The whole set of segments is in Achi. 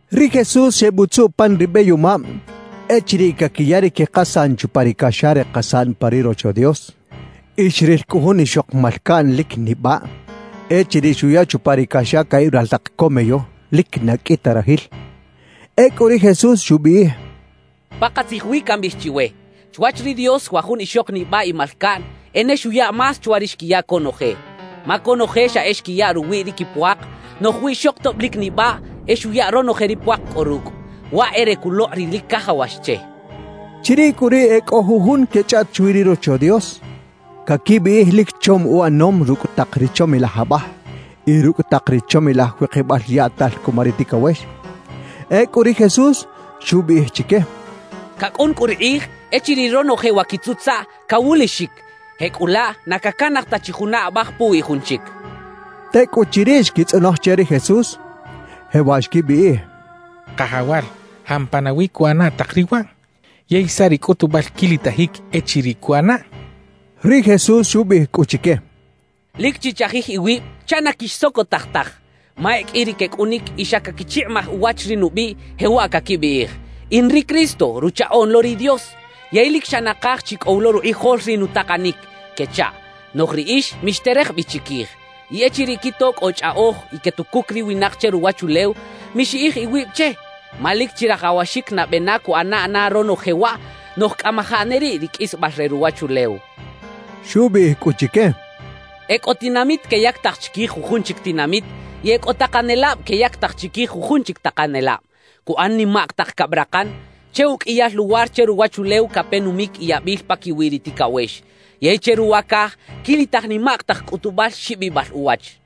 Ri Jesús xebutzuꞌ pan ri beyomab echiriꞌ caquiya ri quikasaꞌn chupa ri caxa re kasaꞌn pa ri Rocho Dios. Y xril cꞌu jun ixok malcaꞌn lic nibaꞌ echiriꞌ xuya chupa ri caxa caꞌib raltak co meyo lic na qꞌui ta rajil. Ecꞌu ri Jesús xubiꞌij: —Pakatzij wi cambiꞌij chiwe, chwach ri Dios wa jun ixok nibaꞌ y malcaꞌn e ne xuya más chwa ri xquiya conoje. Ma conoje xa e xquiya ruwiꞌ ri quipuak; noꞌj wiꞌxok tob lic nibaꞌ e xuya ronoje ri puak cꞌo rucꞌ, waꞌ e re culokꞌ ri lic cajawax che —xcha ri Jesús. Chiriꞌ cꞌu riꞌ e cꞌo jujun quechꞌaꞌt chwi ri Rocho Dios, caquibiꞌij lic chom uꞌanom rucꞌ tak ri chomilaj abaj y rucꞌ tak ri chomilaj wikibal yaꞌtal cuma ri ticawex. Ecꞌu ri Jesús xubiꞌij chique: —Cacꞌun cꞌu ri kꞌij echiriꞌ ronoje wa quitzutzaꞌ, cawulixic; jecꞌulaꞌ, na cacanaj ta chi juna abaj puwiꞌ jun chic —xchaꞌ. Tecꞌuchiriꞌ xquitzꞌonoj che ri Jesús, jewaꞌ xquibiꞌij: —Kajawal, ¿jampa nawi cuꞌana tak riꞌ waꞌ? ¿Yey saꞌ ri cꞌutubal quilitajic echiriꞌ cuꞌanaꞌ? —xechaꞌ. Ri Jesús xubiꞌij cꞌu chique: —Lic chichajij iwib chaꞌ na quixsocotaj taj; ma e qꞌui ri quecꞌunic y xa caquichikꞌimaj uwach ri nubiꞌ, jewaꞌ caquibiꞌij: “In ri Cristo, Ruchaꞌoꞌn lo ri Dios, yey lic xa nakaj chi cꞌo wi lo rukꞌijol ri nutakanic,” quechaꞌ. Noꞌj riꞌix mixterej bi chiquij. Y echiriꞌ quito cꞌo chꞌaꞌoj y quetucuc ri winak che ruwachulew, mixiꞌij iwib che. Ma lic chirajawaxic nabe na cuꞌana na ronoje waꞌ, noꞌj cꞌamajaꞌ ne riꞌ ri qꞌuisbal re ruwachulew —xchaꞌ. Xubiꞌij cꞌu chique: «Ecꞌo tinamit queyactaj chiquij jujun chic tinamit y e cꞌo takanelab queyactaj chiquij jujun chic takanelab. Cuꞌan nimak tak cabrakan. Che uqꞌuiyal luwar che ruwachulew cape numic y yabil paquiwi ri ticawex. Yey che ruwa caj quilitaj nimak tak cꞌutubal xibibal uwach.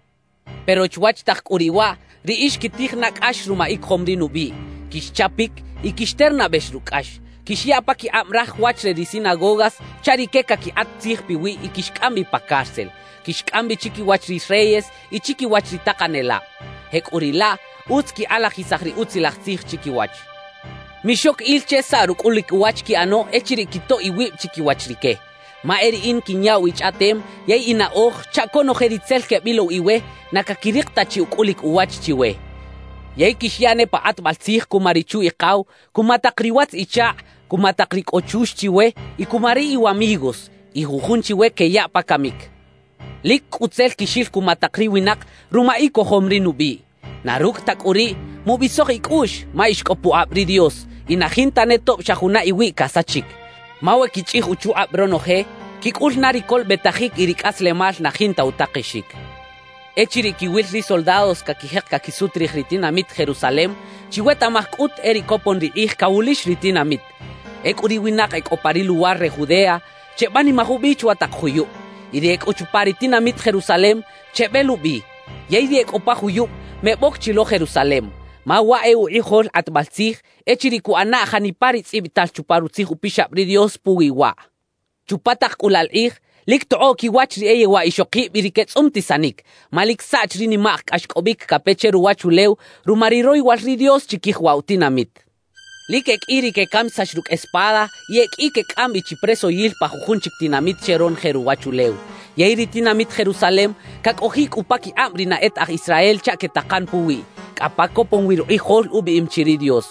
»Pero chwach tak cꞌu riꞌ waꞌ, riꞌix quitij na cꞌax ruma icojom ri nubiꞌ, quixchapic y quixternabex rucꞌ cꞌax, quixyaꞌ paquikꞌab raj wach re ri sinagogas chaꞌ rique caquikꞌat tzij piwiꞌ y quixcꞌam bi pa cárcel, quixcꞌam bi chiquiwach ri reyes y chiquiwach ri takanelab. Jecꞌuriꞌlaꞌ, utz quikꞌalajisaj ri Utzilaj Tzij chiquiwach. Mixoc il che saꞌ rucꞌulic uwach quiꞌano echiriꞌ quitoꞌ iwib chiquiwach rique; ma e riꞌin quinyaꞌw ichꞌaꞌtem yey inaꞌoj chaꞌ conoje ri tzel quebilow iwe na caquirik ta chi ucꞌulic uwach chiwe. »Yey quixyaꞌ ne pa kꞌatbal tzij cuma richu-ikaw, cuma tak riwatz-ichakꞌ, cuma tak ri cꞌo chux chiwe y cuma ri iwamigos. Y jujun chiwe queyaꞌ pa camic. Lic cꞌu tzel quixil cuma tak ri winak ruma icojom ri nubiꞌ. Na rucꞌ ta cꞌu riꞌ, mubisoj icꞌuꞌx ma ix cꞌo pukꞌab ri Dios y na jinta ne tob xa juna iwiꞌ casachic. Ma we quichꞌij uchukꞌab ronoje, quicꞌul na ri colobetajic y ri cꞌaslemal na jinta utakexic. »Echiriꞌ quiwil ri soldados caquijek caquisut rij ri tinamit Jerusalem, chiwetaꞌmaj cꞌut e riꞌ copon ri kꞌij cawulix ri tinamit. Ecꞌu ri winak e cꞌo pa ri luwar re Judea, chebanimaj ubi chwa tak juyub; y ri e cꞌo chupa ri tinamit Jerusalem chebelubi; yey ri e cꞌo pa juyub, meboc chi lo Jerusalem, ma waꞌ e ukꞌijol kꞌatbal tzij, echiriꞌ cuꞌanaꞌ janipa ri tzꞌibital chupa Rutzij Upixab ri Dios puwi waꞌ. Chupa tak cꞌu laꞌ la kꞌij, lic tokꞌoꞌ quiwach ri e yewaꞌ ixokib y ri quetzꞌumtisanic, ma lic saꞌch ri nimak cꞌaxcꞌobic cape che ruwachulew ruma ri royowal ri Dios chiquij waꞌ wa tinamit. »Lic e qꞌui ri quecamisax rucꞌ espada y e qꞌui quecꞌam bi chi presoyil pa jujun chic tinamit che ronoje ruwachulew. Yey ri tinamit Jerusalem cacꞌojiꞌ cꞌu paquikꞌab ri na e ta aj Israel chaꞌ quetakan puwiꞌ, cꞌa pa copon wi rukꞌijol ubiꞌim chi ri Dios.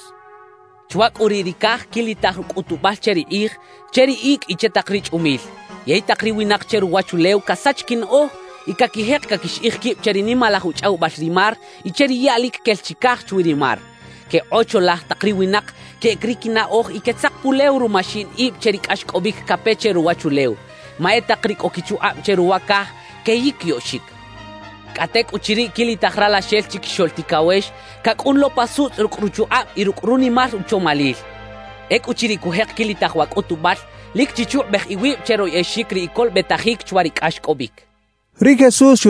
»Chwa cꞌu riꞌ ri caj quilitaj cꞌutubal che ri kꞌij, che ri icꞌ y che tak ri chꞌumil; yey tak ri winak che ruwachulew casach quinaꞌoj y caquijek caquixiꞌij quib che ri nimalaj uchꞌawibal ri mar y che ri yaꞌ lic quel chicaj chwi ri mar. Quekꞌocholaj tak ri winak, queꞌec ri quinaꞌoj y quetzak pulew ruma xiꞌin ib che ri cꞌaxcꞌobic cape che ruwachulew; ma e tak ri cꞌo quichukꞌab che ruwa caj queyiquiyoꞌxic. Cꞌa tecꞌuchiriꞌ quilitaj Ralaxel Chiquixoꞌl Ticawex cacꞌun lo pa sutzꞌ rucꞌ ruchukꞌab y rucꞌ runimal uchomalil. Ecꞌuchiriꞌ cujek quilitaj wa cꞌutubal, lic chichukꞌubej iwib che royꞌexic ri icolobetajic chwa ri cꞌaxcꞌobic» xcha ri Jesús.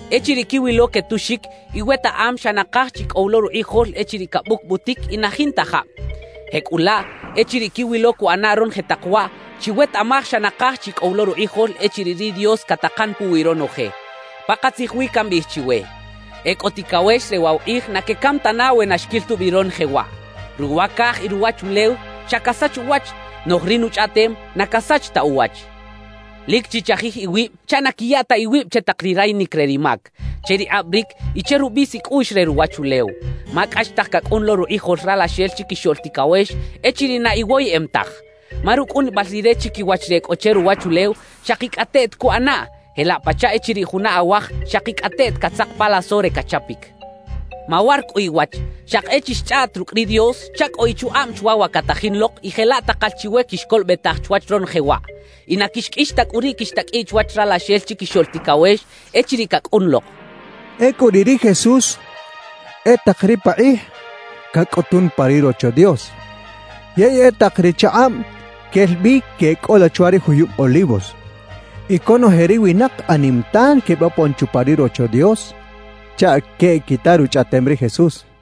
Echiriꞌ quiwilo quetuxic, iwetaꞌam xa nakaj chi cꞌo wi lo rukꞌijol echiriꞌ cabucbutic y na jinta jab. Jecꞌulaꞌ echiriꞌ quiwilo cuꞌana ronoje tak waꞌ, chiwetaꞌmaj xa nakaj chi cꞌo wi lo rukꞌijol echiriꞌ ri Dios catakan puwi ronoje. Pakatzij wi cambiꞌij chiwe: E cꞌo ticawex re waꞌ wa kꞌij na quecam tana we na xquil tubi ronoje waꞌ. Ruwa caj y ruwachulew xa casach uwach, noꞌj ri nuchꞌaꞌtem na casach ta uwach. »Lic chichajij iwib chaꞌ na quiya ta iwib che tak ri rayinic re ri mac, che ri kꞌabaric y che rubis icꞌuꞌx re ruwachulew, ma cꞌaxtaj cacꞌun lo rukꞌijol Ralaxel Chiquixoꞌl Ticawex echiriꞌ na iwoyeꞌem taj. Ma rucꞌunibal Rire chiquiwach ri e cꞌo che ruwachulew, xakicꞌateꞌt cuꞌanaꞌ, jelaꞌ pachaꞌ echiriꞌ juna awaj xakicꞌateꞌt catzak pa laso re cachapic. »Mawar cꞌu iwach, xaki e chixchꞌaꞌt rucꞌ ri Dios chaꞌ cꞌo ichukꞌab chwa wa catajin lok y jelaꞌ takal chiwe quixcolobetaj chwach ronoje waꞌ, y na quixqꞌuix ta cꞌu riꞌ quixtaqꞌuiꞌ chwach Ralaxel Chiquixoꞌl Ticawex echiriꞌ cacꞌun lok» xchaꞌ. Ecꞌu riꞌ ri Jesús e tak ri pakꞌij cacꞌutun pa ri Rocho Dios yey e tak ri chakꞌab quel bi queꞌcꞌola chwa ri juyub Olivos. Y conoje ri winak anim tan quebopon chupa ri Rocho Dios chaꞌ queꞌquita ruchꞌaꞌtem ri Jesús.